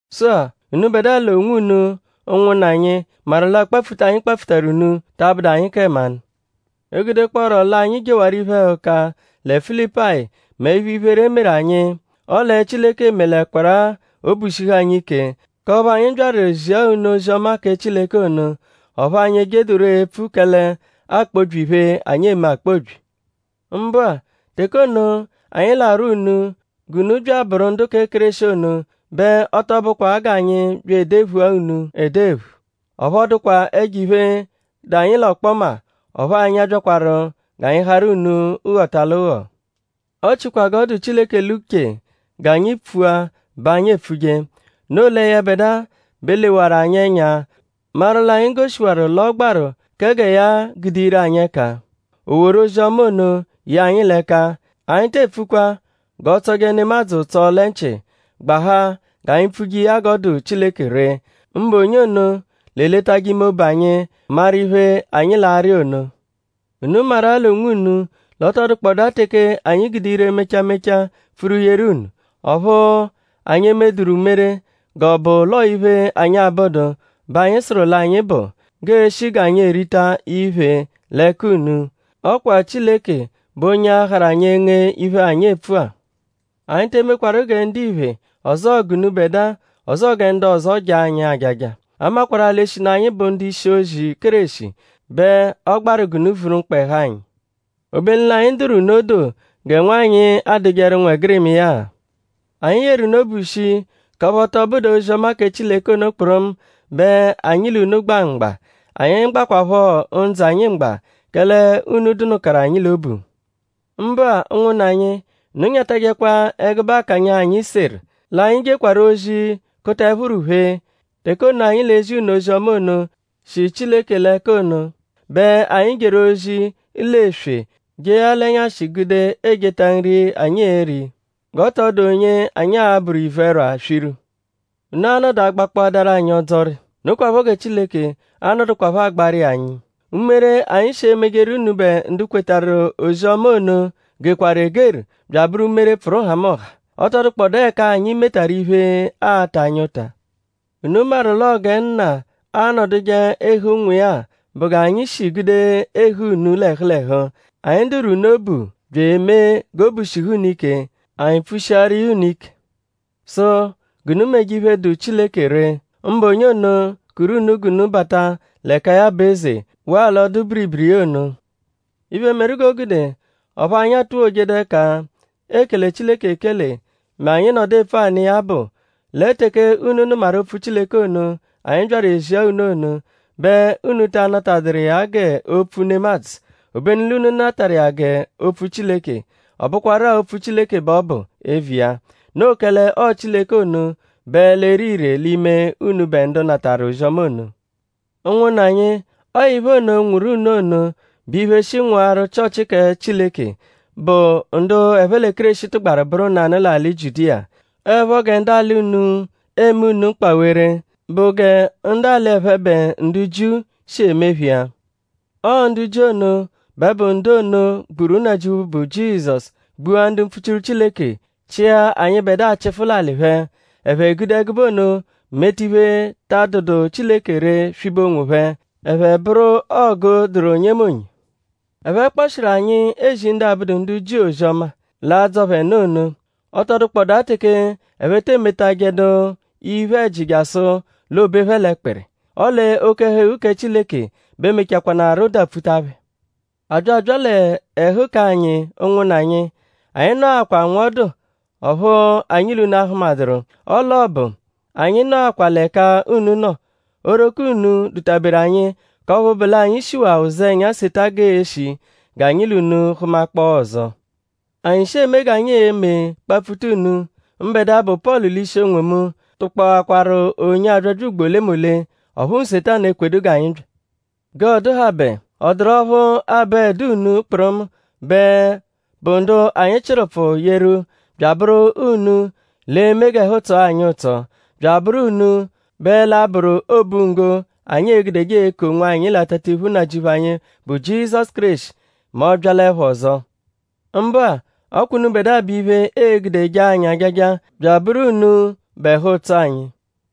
Sụ-a; unubẹdua l'onwunu; ụnwunna anyi; maru l'akpapfuta, anyi kpapfutaru unu ta abụdu anyi kẹ mmanụ. E -gudekpọoru l'anyi jewaru iphe-ẹhuka lẹ Filipayi mẹ iphe-iphere, e meru anyi; ọle Chileke melẹkwaru-a obu shihu anyi ike; k'ọphu anyi byaru ezia unu ozi-ọma kẹ Chileke ono. Ọphu anyi ejedururọ epfu kẹle aakpobyi iphe, anyi eme akpobyi. Mbụ-a; teke ono, anyi l'arwọ unu g'unu bya abụru ndu kẹ Kéreshi ono bẹ ọ tọ bụkwa g'anyi bya edephua unu edephu; ọphu ọ dụkwa ẹjo-iphe, dụ anyi l'ọkpoma; ọphu anyi abyakwaru g'anyi harụ unu ghọta l'ụgho. Ọ chikwa g'ọ dụ Chileke l'uche g'anyi pfua bẹ anyi epfuje. Noo lẹ yẹbedua bẹ lewaru anyi ẹnya maru l'anyi goshiwaru l'ọ gbaru kẹ gẹ ya gude ire anyi ẹka; o woru ozi-ọma ono ye anyi l'ẹka. Anyi te epfukwa g'ọ tsọje nemadzụ ụtso lẹ nchị; gbahaa g'anyi pfuje iya g'ọo-dụ Chileke ree; mbụ onye ono, l'eletajẹ ime obu anyi; maru iphe, anyi l'arị ono. Unu maru-a l'onwunu l'ọ tọ dụkpodaa teke anyi gude ire mecha mecha pfuru yeru unu. Ọphu anyi emeduru umere g'ọ bụ l'ọo iphe, anyi abụdu bẹ anyi sụru l'anyi bụ; g'eeshi g'anyi erita iphe l'ẹka unu. Ọ kwa Chileke bụ onye a-harụ anyi enge iphe, anyi epfua. Anyi te emekwaru gẹ ndiphe; ọzoo g'unubẹdua; ọzoo gẹ ndu ọzo jaa anyi ajaja. A makwarụ-a l'eshinu anyi bụ ndu-ishi-ozi Kéreshi bẹ ọ gbaru g'unu vuru mkpa-ẹhu anyi; obenu l'anyi dụru unu odoo gẹ nwanyị adụjeru ụnwegirima iya-a. Anyi yeru unu obu shii; k'ọphu ọ tọ bụdu-a ozi-ọma kẹ Chileke ono kpụrumu bẹ anyi l'unu gba mgba; anyi gbakwaphọ ndzụ anyi mgba; kẹle unu dụnukaru anyi l'obu. Mbụ-a; ụnwunna anyi; unu nyatajẹkwa ẹgube akanya, anyi seru; l'anyi jekwaru ozi kuta ẹphuru phee. Teke ono anyi l'ezi unu ozi-ọma ono, shi Chileke l'ẹka ono bẹ anyi jeru ozi l'eswe jee ya l'ẹnyashi gude ejeta nri, anyi e-ri; g'ọ tọ dụ onye anyi a-bụru ivu-ẹrwa swiru. Unu a-nọdu agbakpọadaru anyi ọdzori. Nokwaphọ gẹ Chileke a-nọdukwapho agbaru iya anyi. Umere, anyi shi emejeru unubẹ ndu kwetarụ ozi-ọma ono gekwaru egeru bya abụru umere, pfụru nhamụnha. Ọ tọ dụkpodaa ẹka anyi metaru iphe, aata anyi ụta. Unu maru l'ọo gẹ nna anọduje ehe ụnwu iya-a bụ g'anyi shi gude ehe unu l'ẹhu l'ẹhu. Anyi dụru unu obu; bya emee g'obu shihu unu ike; anyi pfushiaru iya unu ike; sụ g'unu meje iphe, dụ Chileke ree; mbụ onye ono, kuru unu g'unu bata l'ẹka ya bụ eze; waa l'ọdu-biribiri iya ono. Iphe, meru g'o gude ọphu anyi atuwojedu ẹka ekele Chileke ekele mẹ anyi -nọdu epfu anụ iya bụ; lẹ teke unu nụmaru opfu Chileke ono, anyi byaru ezia unu ono bẹ unu ta anatadụru iya gẹ opfu nemadzụ; obenu l'unu natarụ iya gẹ Opfu Chileke; ọ bụkwarua Opfu Chileke bẹ ọ bụ eviya. Noo kẹle ọo Chileke ono bẹ l'ere ire l'ime unubẹ ndu natarụ ozi-ọma ono. Ụnwunna anyi; ọo iphe ono, nwụru unu ono bụ iphe, shi nwụaru Chịochi kẹ Chileke, bụ ndu ẹphe lẹ Kéreshi tụgbaru bụru nanụ l'alị Jiudiya. Ọo 'ẹpho gẹ ndu alị unu eme unu mkpawere bụ gẹ ndu alị ẹphebe ndu Jiu shi eme phẹ iya. Ọo ndu Jiu ono bẹ bụ ndu ono, gburu Nnajịuphu, bụ Jizọsu; gbua ndu mpfuchiru Chileke; chịa anyịbedua chịfu l'alị phẹ. Ẹphe gude ẹgube ono meta iphe, ta adụdu Chileke ree swibe onwophẹ. Ẹphe bụru ọgu dụru onyemonye. Ẹphe kpọshiru anyi ezi ndu abụdu ndu Jiu ozi-ọma, l'adzọ phẹ nụ ono. Ọ tọ dụkpodaa teke ẹphe te emetajẹdu iphe-ẹji jasụ l'oobe phẹ l'ẹkpiri. Ọle oke-ẹhu-eghu kẹ Chileke bẹ mechakwanaarụ dapfuta phẹ. A bya abya l'ẹhu k'anyi; ụnwunna anyi; anyi nọakwaru nwọdu ọphu anyi l'unu ahụmaduru; ọle obu anyi nọkwa-a l'ẹka unu nọ. Oghoroko unu dụta-beru anyi; k'ọphu bụ l'anyi shiwaa ụzenya seta g'eeshi g'anyi l'unu hụmakpoo ọzo. Anyi shi eme g'anyi eme kpapfuta unu; mbẹdua, bụ Pọlu l'ishi onwomu tụkpoakwaru onyo abyabya ugbo olemole; ọphu Nsetanu ekwedu g'anyi bya. G'ọoduhabe;?ọ dụru ọphu abụedu unu kpụrumu bẹ bụ ndu anyi chịru ụpfu yeru bya abụru unu l'e-me g'ẹhu tsọo anyi ụtso; bya abụru unu bẹ l'a-bụru obunggo, anyi e-gudeje eku onwanyi l'atatiphu Nnajịuphu anyi, bụ Jizọsu Kéreshi mẹ ọ -byalẹpho ọzo. Mbụ-a; ọ kwa unubẹdua bụ iphe, ee-gude jaa anyi ajaja bya abụru unu bụ ẹhu-ụtso anyi.